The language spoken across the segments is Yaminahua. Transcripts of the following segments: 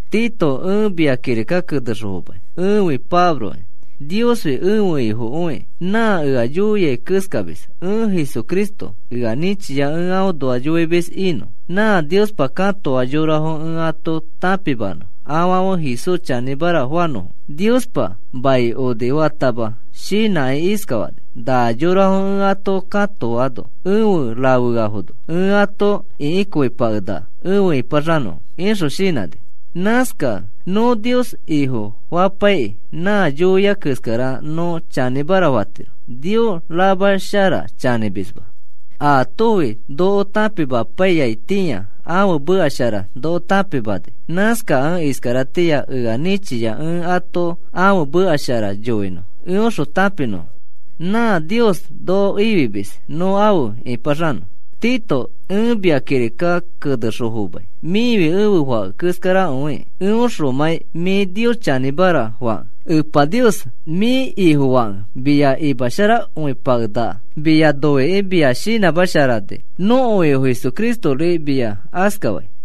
Tito, ẽ mia kirika kenexõ fomai. Ẽfi Pabloki, Niosfi ẽfe Ifokõiki. Nã ea yoiai keskamis ẽ. Jesucristo ea nĩchia ẽ aõnoa yoimis inõ, nã Niospa katoa yorafo ẽ ato tãpimanõ afãfe Jesús chanĩmara fanõfo. Niospa mai onifatama shinãkĩ iskafani: “Na yorafo ẽ ato katoano efe rafeaifono ẽ ato ĩkikõipakenaka efe ĩpaxanõfo,” ixõ shinãni. Nãskakẽ nõ Nios Ifofapaikĩ nã yoiai keskara nõ chanĩmara fatiro. Nios ramashara chanĩmisma. Aatofi noko tãpimapaiyaitĩa ãfe meka shara noko tãpimani. Nãskakẽ iskaratĩa ea nĩchia ẽ ato ãfe meka shara yoinõ eõxõ tãpinõfo. Nã Nios noko ifimis nõ afe ĩpaxanõ. Tito, ẽ mia kirika kenexõ fomai. Mĩfi ẽfe fake keskarakõikĩ, eõxomãi mĩ Nios chanĩmara fakẽ. Epa Nios mĩ Ifofakẽ mia imasharakõipakenaka mia noikĩ mia shinãsharamani. Nõko Ifo Jesucristori mia askafai.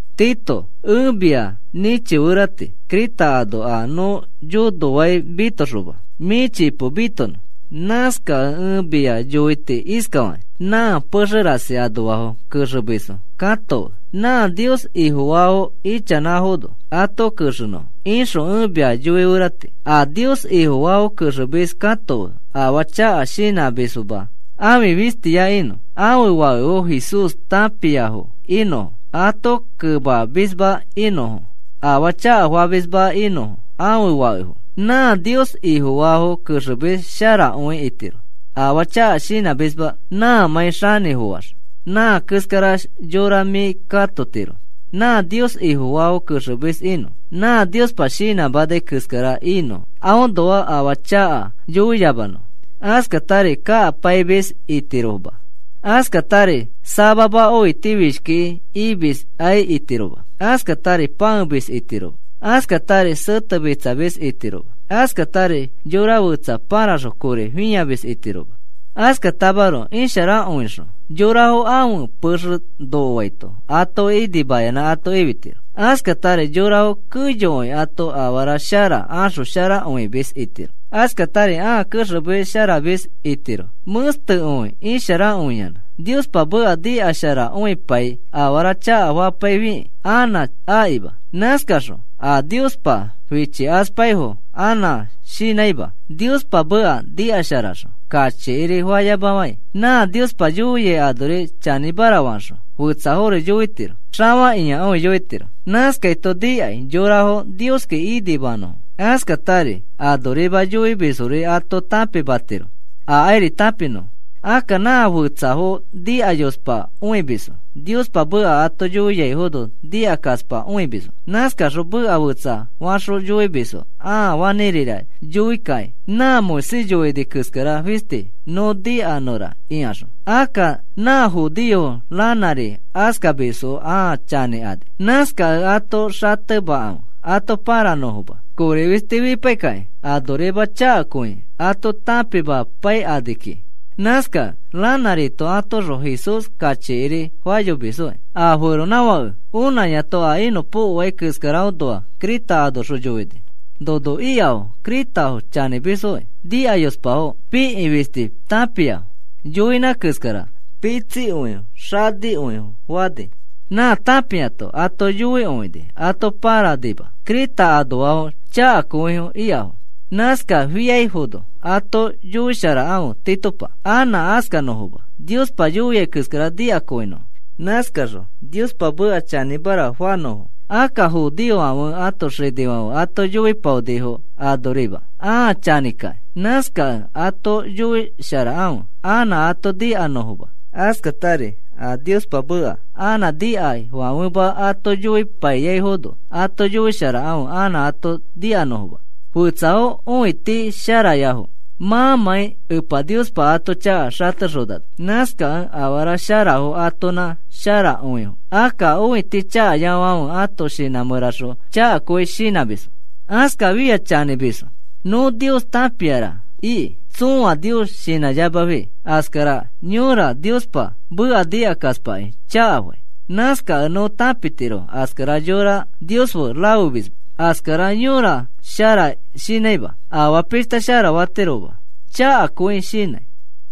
Tito, ẽ mia nĩchiferati Creta ano a nõ yonofai mitoxoma mĩ chipo mitonõ. Nãskakẽ ẽ mia yoiti iskafakĩ: “Nã pexe rasi anoafo kexemisfo katofe nã Nios Ifofaafo ichanãfono ato kexenõ,” ixõ ẽ mia yoiferati. A Nios Ifofaafo kexemis katofe afaa chaka shinãmisma. Ãfi fistiya inõ. Ãfe fakefo Jesús tãpiafo inõfo, ato kemamisma inõfo, afaa chakafamisfoma inõfo ãfe fakefo. Nã Nios Ifofaafo kexemis sharakõi itiro, afaa chaka shinãmisma nãmãi xanĩfoax. Nã keskara yora mĩ katotiro nã Nios Ifofaafo kexemis inõ. Nã Niospa shinãmanai keskara inõ aõnoa afaa chaka yoiyamanõfo. Askatari kakapaimis itiroma. Askatari samama õitifishki imiskai itiroma. Askatari pãemis itiroma. Askatari setemitsamis itiroma. Askatari yora fetsa pãraxõ kori fĩamis itiroma. Askatamaroko isharakõixõ yorafo ãfe pexe nokoaito atoki inimayanã ato ifitiro. Askatari yorafo keyokõi ato afara shara axosharakõimis itiro. Askatari ãa kexemesharamis itiro mẽstekõi isharakõiyanã. Niospa meka nikasharakõipai afara chakafapaifikĩ anã akima. Nãskaxõ a Niospa fichikaspaifo anã shinãima. Niospa meka nikasharaxõ kachikiri fayamafãi, nã Niospa yoiai anori chanĩmara faxõ fetsafori yoitiro. Xafakĩakõi yoitiro. Nãskaito nikai yorafo Nioski inimanõfo. Askatari anorima yoimisfori ato tãpimatiro, akairi tãpinõfo. Akka nã fetsafo nikayospakõimisfo Niospa meka ato yoiaifono nikakaspakõimisfo. Nãskaxõ meka fetsafaxõ yoimisfo ãa fanĩrira yoikakĩ nã Moisés yoini keskara fisti nõ nikanõra ikaxõ. Akka nã judeofo ranãri askamisfo ãa chanĩkani. Nãskakẽ ato xatemafe ato pãranõfoma. Kori fisti fipaikakĩ anorima chakakõi ato tãpimapaikani kiki. Nãskakẽ ranãrito atoõxõ Jesús kachikiri fayomisfoki. A feronãfake onãyato a inõpokoai keskaraõnoa Creta anoxõ yoini: “Nono ikafo, Cretafofi chanĩmisfokĩ, nikayospafo, pikĩ fisti tãpiafo, yoinã keskara pitsikõifo xanikõifo,” fani. Nã tãpiato ato yoikõini ato pãranima. Creta anoafo chakakõi ikafo. Nãskafiaifono ato yoisharafe Titopa, anã askanõfoma, Niospa yoiai keskara nikanõfo. Nãskaxõ Niospa meka chanĩmara fanõfo. Akka judeofãfe ãto xinifãfe ato yoipaonifoki anorima, ãa chanĩkakĩ. Nãskakẽ ato yoisharafe anã ato nikanõfoma. Askatari a Niospa meka anã nikaifãfema ato yoipaiyaifono, ato yoisharafe anã ato nikanõfoma. Fetsafo õiti sharayafo, mãmãi Epa Niospa ato chaka xatexonano. Nãskakẽ afara sharafo atonã sharakõifo. Akka a õiti chakayafãfe ãto shinã mẽraxõ chakakõi shinãmisfo. Askafiax chanĩmisfo, “Nõ Nios tãpiara,” iki, tsõa Nios shinãyamafi. Askara yõra Niospa meka nikakaspakĩ chakafai. Nãskakẽ nõ tãpitiro askara yora Nios fe rafemisma. Askara yõra shara shinãima, afaa pishta shara fatiroma, chakakõi shinãi.